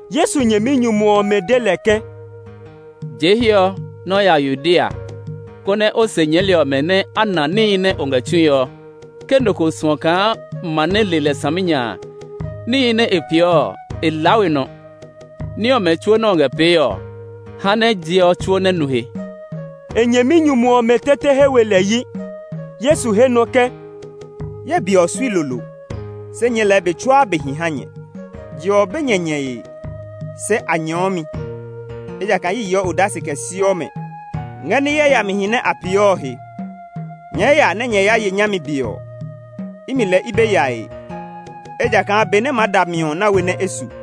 Yesu nyɛminyumu ɔmɛ de lɛ ke, “Jee hiɛ ɔ, nɛ o ya Yudea, konɛ o se nyɛɛli ɔmɛ nɛ a na níhi nɛ o ngɛ tsue ɔ. Ke nɔ ko suɔ kaa ma nɛ le lɛ saminya a, níhi nɛ e peeɔ ɔ, e laa we nɔ. Ní ɔmɛ tsuo nɛ o ngɛ pee ɔ, ha nɛ je ɔ tsuo nɛ nu he.” E nyɛminyumu ɔmɛ tete he we lɛ yi. Yesu he nɔ ke, “Ye be ɔ sui lolo; se nyɛɛ lɛɛ be tsuaa be hi ha nyɛ. Je ɔ be nyɛ nyɛe, se a nyɛɔ mi, ejakaa a yeɔ odase kɛ siɔ mɛ ngɛ ní yayamihi nɛ a peeɔ ɔ he. Nyɛɛ ya nɛ nyɛ ya ye nyami be ɔ. Imi lɛɛ i be yae, ejakaa be nɛ maa da mi ɔ na we nɛ e su.”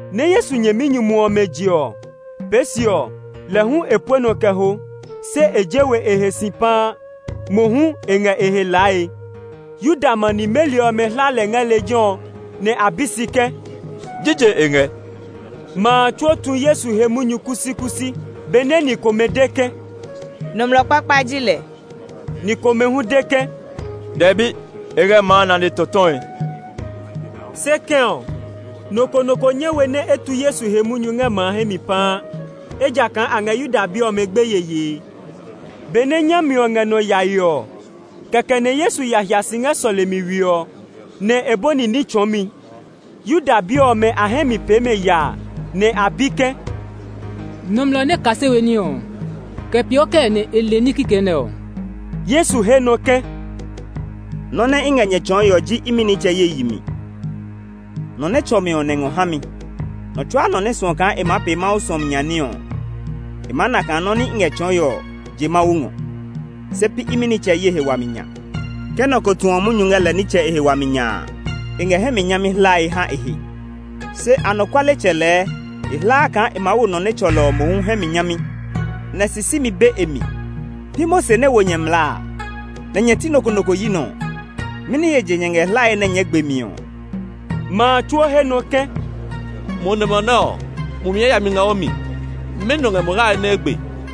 Nɛ Yesu nyɛminyumu ɔmɛ je ɔ, pee se ɔ, lɛ hu e pue nɔ kɛ ho. Se e je we e he si paa; mohu e ngɛ e he lae. Yuda ma nimeli ɔmɛ hla lɛ ngɛ lejɛ ɔ; nɛ a bi si ke, “Jije e ngɛ?” Ma a tsuo tu Yesu he munyu kusikusi. Benɛ ni komɛ de ke, “Nɔmlɔ kpakpa ji lɛ” ɔ, ni komɛ hu de ke, “Dɛbi, e ngɛ ma a nane tɔtɔe”. Se kɛ̃ ɔ, nɔ ko nɔ ko nyɛ we nɛ e tu Yesu he munyu ngɛ ma a hɛ mi paa, ejakaa a ngɛ Yuda bi ɔmɛ gbeye yee. Benɛ nyami ɔ ngɛ nɔ yae ɔ kɛkɛ nɛ Yesu ya hia si ngɛ sɔlemi we ɔ, nɛ e bɔni ní tsɔɔmi. Yuda bi ɔmɛ a hɛ mi pee mɛ yaa, nɛ a bi ke, “Nɔmlɔ nɛ kase we ní ɔ, kɛ peeɔ kɛɛ nɛ e le ní kikɛ nɛ ɔ.” Yesu he nɔ ke, “Nɔ́ nɛ i ngɛ nyɛ tsɔɔe ɔ ji imi nitsɛ ye yi mi; nɔ nɛ tsɔ mi ɔ nɛ ngɔ ha mi. Nɔ tsuaa nɔ nɛ suɔ kaa e maa pee Mawu suɔmi nya ní ɔ, e maa na kaa nɔ́ nɛ i ngɛ tsɔɔe ɔ je Mawu ngɔ, se pi imi nitsɛ ye he wami nya. Ke nɔ ko tuɔ munyu ngɛ lɛ nitsɛ e he wami nya a, e ngɛ hɛ mi nyami hlae ha e he. Se anɔkualetsɛ lɛɛ e hlaa kaa e maa wo nɔ nɛ tsɔ lɛ ɔ mohu hɛ mi nyami, nɛ sisimi be e mi. Pi Mose nɛ wo nyɛ mlaa a? Nɛ nyɛ ti nɔ ko nɔ ko yi nɔ ɔ? Mɛni he je nyɛ ngɛ hlae nɛ nyɛɛ gbe mi ɔ?” Ma a tsuo he nɔ ke, “Mo nɔmlɔ nɛ ɔ, mumi yayami ngɛ o mi! Mɛnɔ ngɛ mo hlae nɛ e gbe?”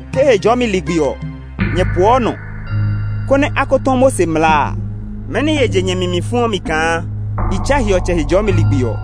Ke Hejɔɔmi ligbi ɔ, nyɛ poɔ nɔ, konɛ a ko tɔ Mose mlaa a, mɛni he je nyɛ mi mi fuɔ mi kaa i tsa hiɔtsɛ Hejɔɔmi ligbi ɔ?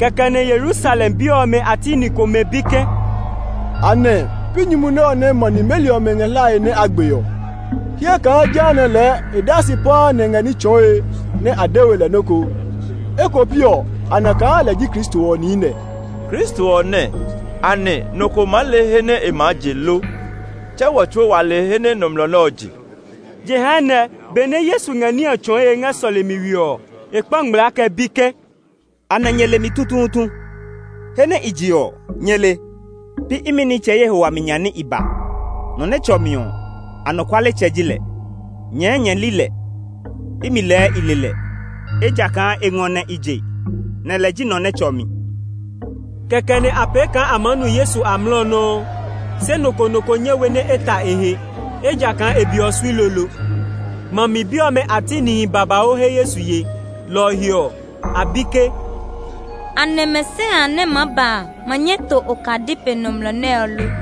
Kɛkɛ nɛ Yerusalem bi ɔmɛ a ti ni komɛ bi ke, “Anɛ pi nyumu nɛ ɔ nɛ ma nimeli ɔmɛ ngɛ hlae nɛ a gbe ɔ? Hyɛ kaa jehanɛ lɛɛ e daa si paa ngɛ ní tsɔɔe nɛ a de we lɛ nɔ́ ko. Eko piɔ a na kaa lɛ ji Kristo ɔ niinɛ. Kristo ɔ nɛɛ, anɛ nɔ ko maa le he nɛ e maa je lo? Tse wɔ tsuo wa le he nɛ nɔmlɔ nɛ ɔ je.” Jehanɛ, benɛ Yesu ngɛ ní ɔ tsɔɔe ngɛ sɔlemi we ɔ, e kpa ngmlaa kɛ bi ke, “Anɛ nyɛ le mi tutuutu? He nɛ i je ɔ, nyɛ le? Pi imi nitsɛ ye he wami nya nɛ i ba. Nɔ nɛ tsɔ mi ɔ, anɔkualetsɛ ji lɛ; nyɛɛ nyɛ li lɛ. Imi lɛɛ i le lɛ, ejakaa e ngɔ nɛ i je, nɛ lɛ ji nɔ nɛ tsɔ mi.” Kɛkɛ nɛ a pee kaa a maa nu Yesu amlɔ nɔuu, se nɔ ko nɔ ko nyɛ we nɛ e ta e he, ejakaa e be ɔ sui lolo. Ma mi bi ɔmɛ a ti nihi babauu he Yesu ye, lɔ ɔ he ɔ, a bi ke, “Anɛ Mesia a nɛ maa ba a ma nyɛ to okadi pe nɔmlɔ nɛ ɔ lo?”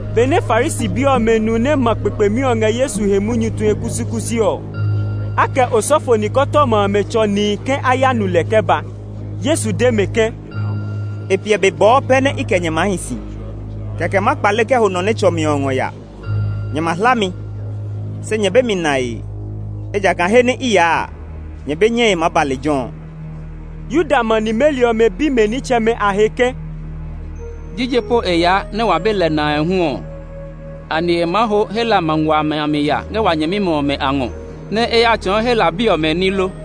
Benɛ Farisi bi ɔmɛ nu nɛ ma kpekpemi ɔ ngɛ Yesu he munyu tue kusikusi ɔ, a kɛ osɔfo nikɔtɔma amɛ tsɔ nihi ke a ya nu lɛ kɛ ba. Yesu de mɛ ke, “E piɛ be bɔɔ pɛ nɛ i kɛ nyɛ maa hi si, kɛkɛ ma kpale kɛ ho nɔ nɛ tsɔ mi ɔ ngɔ ya. Nyɛ ma hla mi, se nyɛ be mi nae; ejakaa he nɛ i yaa a, nyɛ be nyɛe maa ba lejɛ ɔ.” Yuda ma nimeli ɔmɛ bi mɛ nitsɛmɛ a he ke, “Jije po e yaa nɛ wa be lɛ nae hu ɔ? Anɛ e maa ho Hela ma nguaa amɛ a mi ya ngɛ wa nyɛmimɛ ɔmɛ a ngɔ, nɛ e ya tsɔɔ Hela bi ɔmɛ ní lo?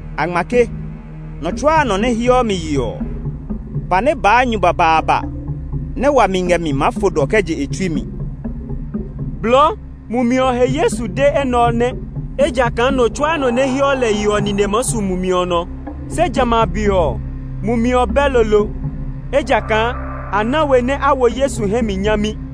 A ngma ke, ‘Nɔ tsuaa nɔ nɛ heɔ mi yeɔ ɔ, pa nɛ baa nyu babaaba nɛ wami ngɛ mi maa fo dɔ kɛ je e tsui mi.’” Blɔɔ, Mumi ɔ he Yesu de enɛ ɔ nɛ, ejakaa nɔ tsuaa nɔ nɛ heɔ lɛ yeɔ ɔ nine maa su Mumi ɔ nɔ. Se jamɛ a be ɔ, Mumi ɔ bɛ lolo, ejakaa a na we nɛ a wo Yesu hɛ mi nyami.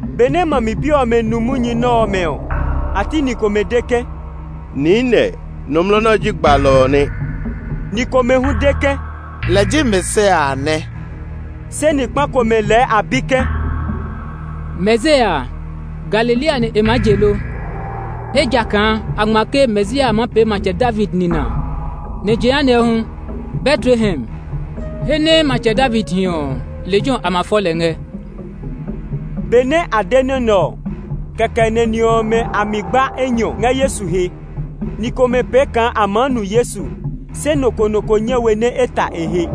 Benɛ ma mi bi ɔmɛ nu munyu nɛ ɔmɛ ɔ, a ti ni komɛ de ke, “Niinɛ, nɔmlɔ nɛ ɔ ji gbalɔ ɔ nɛ.” Ni komɛ hu de ke, “Lɛ ji Mesia a nɛ.” Se ni kpa komɛ lɛɛ a bi ke, “Mesia a, Galilea nɛ e maa je lo? Ejakaa a ngma ke Mesia a maa pee Matsɛ David nina; nɛ jehanɛ hu, Betlehem, he nɛ Matsɛ David hi ɔ, lejɛ ɔ a ma fɔ lɛ ngɛ.” Benɛ a de nɔ́ nɛ ɔ, kɛkɛ nɛ ni ɔmɛ a mi gba enyɔ ngɛ Yesu he. Ni komɛ pee kaa a maa nu Yesu, se nɔ ko nɔ ko nyɛ we nɛ e ta e he.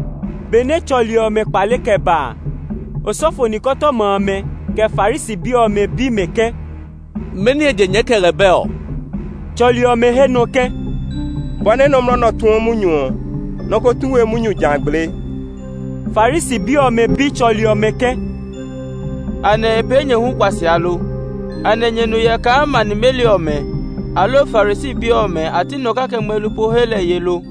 Benɛ tsɔli ɔmɛ kpale kɛ ba a, osɔfo nikɔtɔma amɛ, kɛ Farisi bi ɔmɛ bi mɛ ke, “Mɛni he je nyɛɛ kɛ lɛ bɛ ɔ?” Tsɔli ɔmɛ he nɔ ke, “Bɔ nɛ nɔmlɔ nɛ ɔ tuɔ munyu ɔ, nɔ ko tu we munyu ja gblee.” Farisi bi ɔmɛ bi tsɔli ɔmɛ ke, “Anɛ e pee nyɛ hu kuasia lo? Anɛ nyɛ nu hyɛ kaa ma nimeli ɔmɛ, aloo Farisi bi ɔmɛ a ti nɔ kake ngmelu po he lɛ ye lo?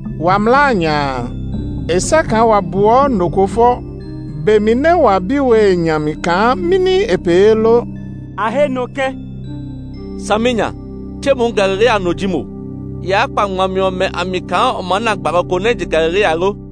“Wa mlaa a nya a, e sɛ kaa wa buɔ nɔ ko fɔ be mi nɛ wa bi we e nya mi kaa mɛni e pee lo.” A he nɔ ke, “Saminya! Tse mo hu Galilea no ji mo! Yaa kpa ngmami ɔmɛ a mi kaa o maa na gbalɔ ko nɛ je Galilea lo!”